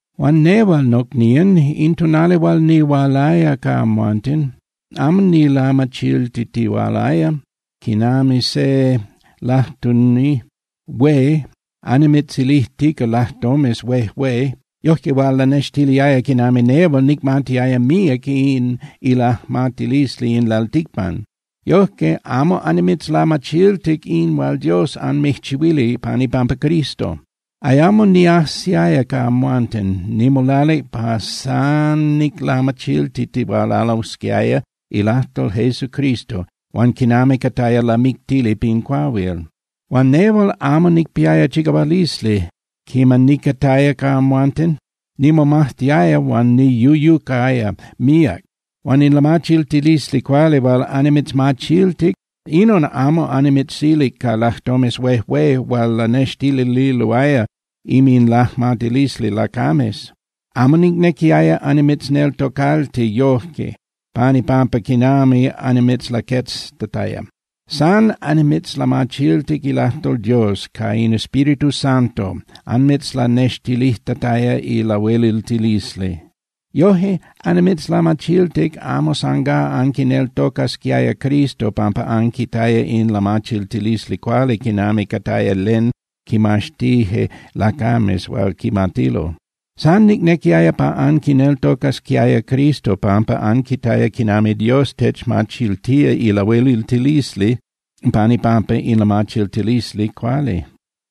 Huan nehual, nocnían, in tonali hual nihualaya ca amhuanten, amo nilamachiltitihualaya quinami se lajtuni hué annimitzilijtica lajtomes huejué yojque hual lanextiliaya quinami nehual nicmatiaya míac in ilajmatilisli in lalticpan. Yojque amo annimitzlamachiltic in hual Dios anmijchihuilic pan ipampa Cristo. Ayamo niajsiaya ca amhuanten, nimolalic pa san niclamachiltitihualasquiaya ilajtol Jesucristo huan quinami cataya lamictili pin cuahuil. Huan nehual amo nicpiaya chicahualisli quiman nicataya ca amhuanten. Nimomajtiaya huan niyuyucaya míac. Huan in lamachiltilisli cuali hual annimitzmachiltic, inon amo annimitzilic ca lajtomes huejué hual lanextililoaya inminlajmatilisli lacames. Amo nicnequiaya annimitzneltocalti yoje pan ipampa quinami annimitzlaqueztataya. San annimitzlamachiltic ilajtol Dios ca in Espíritu Santo anmitzlanextilijtataya ilahueliltilisli. Yoje annimitzlamachiltic amo sangá anquineltocasquiaya Cristo pampa anquitaya in lamachiltilisli cuali quinami cataya len quimaxtije lacames hual quimatilo. San nicnequiaya pa anquineltocasquiaya Cristo pampa anquitaya quinami Dios techmachiltía ilahueliltilisli pan ipampa in lamachiltilisli cuali.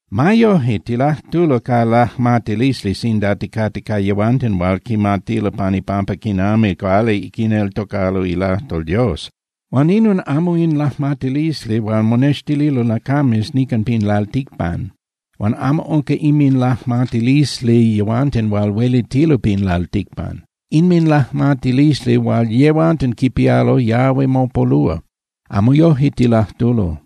Ma yoje, tilajtulo ca lajmatilisli sinda ticate ca yehuanten hual quimatilo pan ipampa quinami cuali quineltocalo ilajtol Dios. Huan inon amo in lajmatilisli hual monextililo lacames nican pin lalticpan. Huan amo unca inminlajmatilisli yehuanten hual huelitilo pin lalticpan. Inminlajmatilisli hual yehuanten quipialo yahui mopolúa. Amo yoje tilajtulo.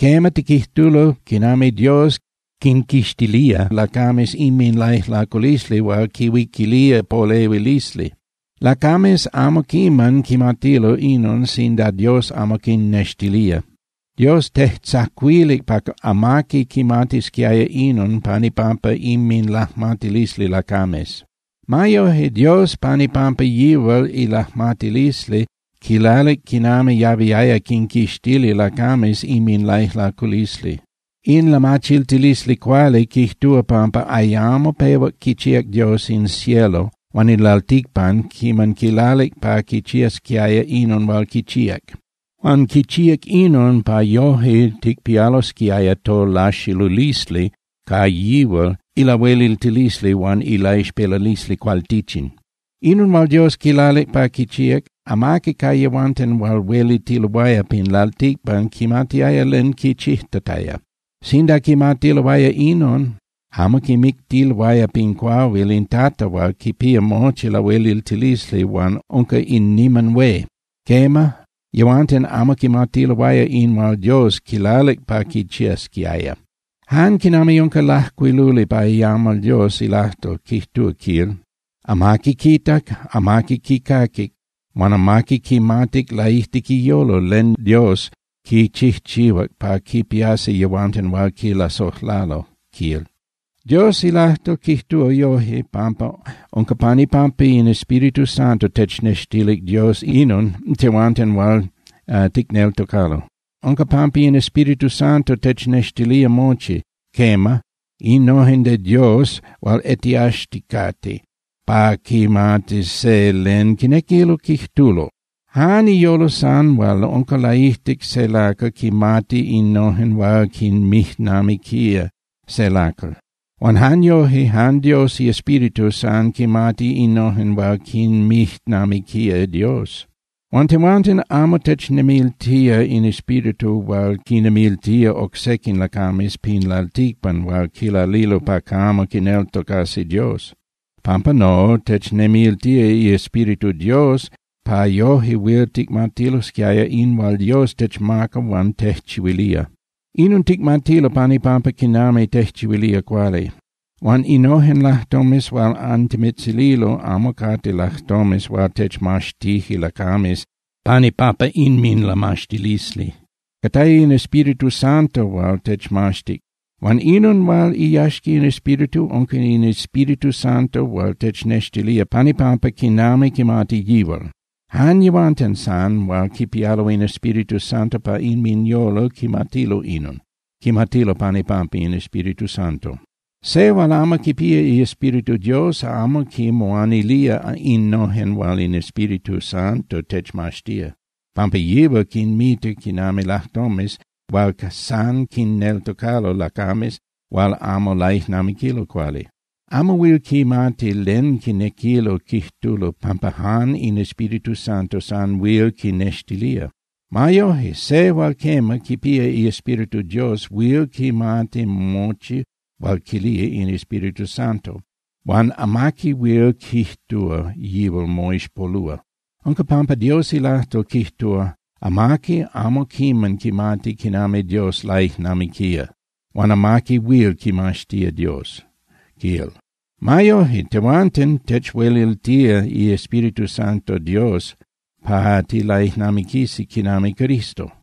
Quema, tiquijtulo quinami Dios quinquixtilía lacames inminlaijlaculisli hual quinhuiquilía polehuilisli. Lacames amo quiman quimatilo inon sinda Dios amo quinnextilía. Dios tejtzacuilic pa amaqui quimatisquiaya inon pan ipampa inminlajmatilisli lacames. Ma yoje Dios pan ipampa yihual ilajmatilisli quilalic quinami yahuiaya quinquixtili lacames inminlaijlaculisli. In lamachiltilisli cuali quijtúa pampa ayamo pehuac quichíac Dios in cielo huan in lalticpan quiman quilalic pa quichiasquiaya inon hual quichíac. Huan quichíac inon pa yoje ticpialosquiaya tolaxilulisli ca yihual ilahueliltilisli huan ilaixpelalisli cualtichin. Inon hual Dios quilalic pa quichíac, amaqui ca yehuanten hual huelitiloaya pin lalticpan quimatiaya len quichijtataya. Sinda quimatiloaya inon, amo quimictiloaya pin cuahuil in Tata hual quipía mochi lahueliltilisli huan unca in niman hué. Quema, yehuanten amo quimatiloaya in hual Dios quilalic pa quichiasquiaya. Jan quinami unca lajcuiluli pa iamal Dios ilajtol, quijtúa, quil: Amaqui quitac, amaqui quicaquic, huan amaqui quimatic laijtic iyolo len Dios quichijchihuac pa quipiasi yehuanten hual quilasojlalo, quil. Dios ilajtol quijtúa yoje, pampa unca pan ipampa in Espíritu Santo technextilic Dios inon tehuanten hual ticneltocalo. Unca pampa in Espíritu Santo technextilía mochi, quema, innojen de Dios hual etiaxticate pa quimatis se len quinequilo quijtulo. Jan iyolo san hual unca laijtic se lacal quinmati innojen hual quinmijnamiquía se lacal. Huan jan yoje, jan Dios iEspíritu san quinmati innojen hual quinmijnamiquía Dios. Huan tehuanten amo technemiltía in espíritu hual quinnemiltía oc sequin lacames pin lalticpan hual quilalilo pa camo quineltocasi Dios. Pampa no, technemiltía iEspíritu Dios pa yoje huil ticmatilosquiaya in hual Dios techmaca huan tejchihuilía. Inon ticmatilo pan ipampa quinami tejchihuilía cuali. Huan innojen lajtomes hual antimitzililo amo cate lajtomes hual techmaxtije lacames pan ipampa inminlamaxtilisli. Cataya in Espíritu Santo hual techmaxtic. Huan inon hual iyaxca in Espíritu, unca in Espíritu Santo hual technextilía pan ipampa quinami quimati yihual. Jan yehuanten san hual quipialo in Espíritu Santo pa inminyolo quimatilo inon, quimatilo pan ipampa in Espíritu Santo. Se hual amo quipía iEspíritu Dios amo quinmoanilía innojen hual in Espíritu Santo techmaxtía, pampa yihual quinmita quinami lajtomes hual san quinneltocalo lacames hual amo laijnamiquilo cuali. Amo huil quimati len quinequilo quijtulo pampa jan in Espíritu Santo san huil quinextilía. Ma yoje, se hual quema, quipía iEspíritu Dios huil quimati mochi hual quilía in Espíritu Santo, huan amaqui huil quijtúa yihual moixpolúa. Unca pampa Dios ilajtol quijtúa: “Amaqui amo quiman quimatic quinami Dios laijnamiquía huan amaqui huil quimaxtía Dios”, quil. Ma yoje, tehuanten techhueliltía iEspíritu Santo Dios pa tilaijnamiquisi quinami Cristo.